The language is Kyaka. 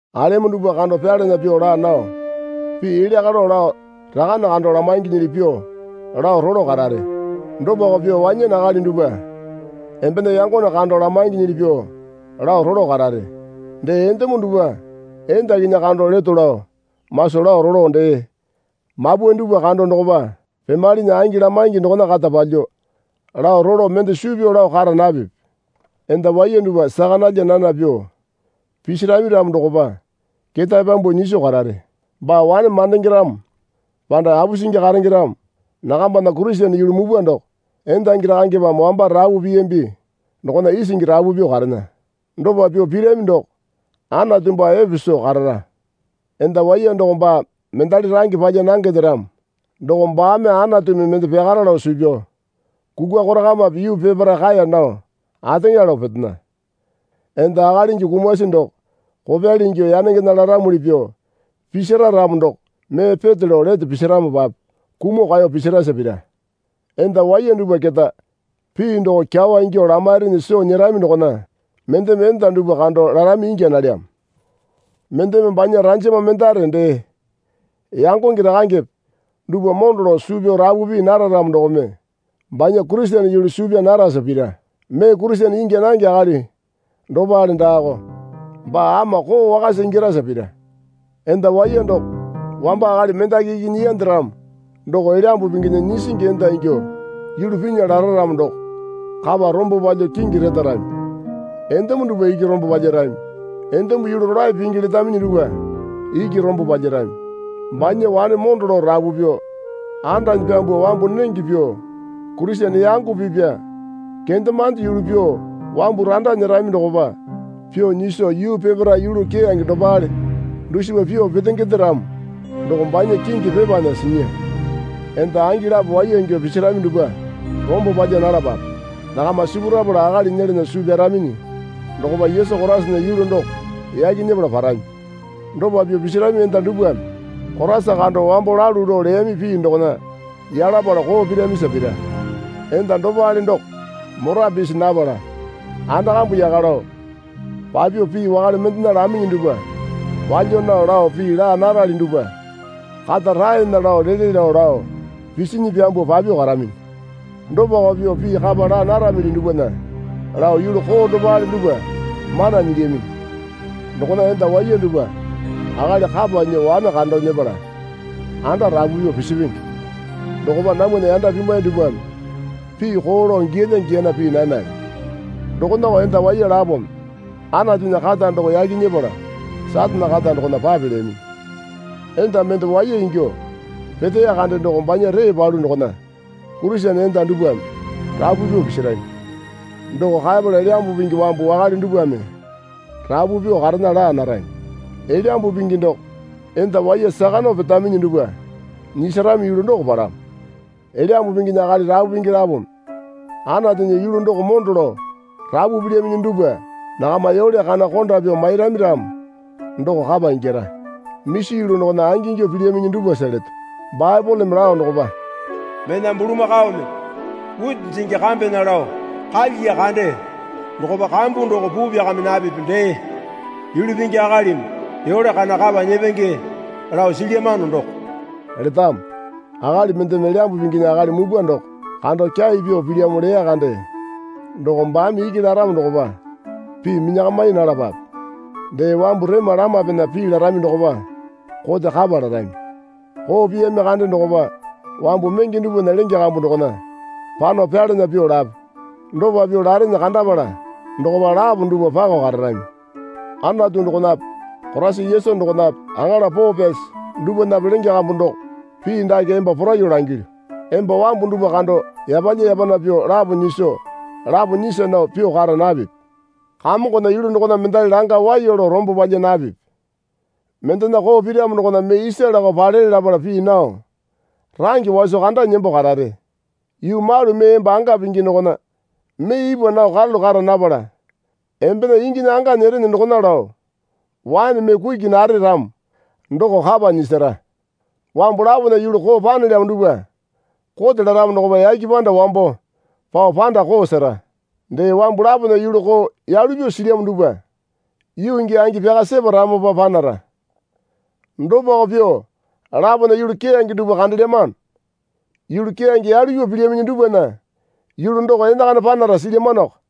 Alemo dupwa kando pyalana pyuo laa nao pii elya kalo lao rakane kando lamainginyili pyuo lao rolo karare. Dopako pyuo wanyane akali dupwa embena yangone kando lamainginyili pyuo lao rolo karare. Dee endemo dupwa endakinyi kando leto lao maso lao rolo dee mapwae dupwa kando dokopa pemalene angi lamaingi dokona kata palyuo lao rolo mende suu pyao lao kara napipi. Enda waiya dupwa saka nalya nana pyuo pisirami ramo dokopa ketae pyambuo nyiso karare. Baa wane mandenge ramo panda apusingi karenge ramo nakambana Kurisene yulu mupwa doko endangi rakangepame wamba rapu piyambi dokona isingi rapu pyuo karena. Dopa pyuo pirami doko Anatu baa epe soo karara. Enda waiya doko baa mendali range palya nangende ramo doko baame Anatumi mende pyakara lao suu pyao kukwa korakamape yuu peparae kaeya nao ateŋa lao petena. Enda akalingi kumasi doko kopyali ingyuo yanengena laramuli pyuo pisira ramo doko mee peto lao lete pisiramopape kumuo kaeyo pisirasa pira. Enda waiya dupwa keta pii doko kyawa ingyuo lamairinyi soo nyerami dokona mendeme enda dupwa kando larami ingya nalyamo. Mendeme banya ranjama mendare dee yangonge rakangepe dupwa mondo lao suu pyao rapu pii nara ramo dokome banya Kurisene yulu suu pyaa narasa pira. Mee Kurisene ingya nange akali dopale daako. Baa ama koo wakasa ingyarasa pira. Enda waiya doko wamba akali mendaki iki nyiyande ramo doko Elyambu Pinginya nyisingi enda ingyuo yulu pinya lara ramo doko kapa rombo palyuo kingi retarami. Endemo dupwa iki rombo palyarami. Endemo yulu rolae pingi letaminyi dupwa iki rombo palyarami. Banya wane mondo lao rapu pyuo andanyi pyambuo wambu nenge pyuo Kurisene yango pipya kendemande yulu pyuo wambu randa nyerami dokopa pyuo nyiso yuu peparae yulu keyange dopale dusipa pyuo petengende ramo doko banya kingi pepana sinya. Enda angi lapo waiya ingyuo pisirami dupwa rombo palya nalapape. Nakama sipurapala akali nyelana suu pyaraminyi dokopa Yesu Koraisana yulu doko yaki nyepala parami. Dopa pyuo pisirami enda dupwame Koraisa kando wambo lalu lao leyami pii dokona yalapala koo piramisa pira. Enda dopale doko mora pisi napala anda kambu yaka lao papyuo pii wakale mendena laminyi dupwa palya nao lao pii laa narali dupwa kata raena lao lele lao lao pisinyi pyambuo papyuo karaminyi. Dopako pyuo pii kapa laa naramili dupwana lao yulu koo dopale dupwa mana nyilyaminyi. Dokona enda waiya dupwa akali kapa nyuo wane kando nyepala anda rapu pyuo pisipenge. Dokopa namwana yanda pimwai dupwame pii koo lao giyalya giyana pii nanale. Dokonako enda waiya lapome Anatunya kata doko yaki nyepala Satane kata dokona papelyaminyi. Enda mende waiya ingyuo peteya kande doko banya ree palu dokona Kurisene enda dupwame rapu pyuo pisirami. Doko kaepala Elyambu Pingi wambu wakale dupwame rapu pyuo karena laa narami. Elyambu Pingi doko enda waiya saka nao petaminyi dupwa nyisarami yulu doko palamo. Elyambu Pinginya akali rapu pingi lapome Anatunya yulu doko mondo lao rapu pilyaminyi dupwa nakama yole kana konda pyuo mairami ramo doko kapa ingyara. Misi yulu dokona angingyuo pilyaminyi dupwasa leto. Baepoleme lao dokopa, Mena bulamakaome witi jingi kambena lao kalyiya kande dokopa kambu doko puu pyakami napipi dee, Yulu pingi akalimi yole kana kapa nyepenge lao silyamano doko letamo. Akali mendeme Elyambu Pinginya akali mupwa doko kando kyai pyuo pilyamo leya kande doko baame iki laramo dokopa pii minyakami nalapape. Dee wambu rema lamapena pii larami dokopa kote kapa larami. Koo piyami kande dokopa wambu menge dupwana lenge kambu dokona pano pyalana pyuo lape dopa pyuo larene kandapala dokopa lapo dupwa pako kararami. Anatu dokonape Koraisa Yesu dokonape aŋala poo pyasi dupwanape lenge kambu doko pii dake emba poraiyuo langilyu. Emba wambu dupwa kando yapalya yapana pyuo lapo nyiso lapo nyisa nao pyuo kara napipi. Kamongona yulu dokona mendali langa waiya lao rombo palya napipi. Mendena koo piramo dokona mee isa lakao palele lapala pii nao range waso kandanyi nembo karare. Yuu malu mee emba anga pingi dokona mee ipwa nao karalu kara napala embena inginya anga nyerene dokona lao waene mee kuki nare ramo doko kapa nyisara. Wambu lapona yulu koo panelyamo dupwa kote laramo dokopa yake panda wambo pao panda koo sera. Dee wambu lapona yulu koo yalu pyuo silyamo dupwa yuu gii angi pyaka separamopa panara. Dopako pyuo lapona yulu keyange dupwa kandelyamano. Yulu keyange yalu pyuo pilyaminyi dupwana yulu doko enakana panara silyamanoko.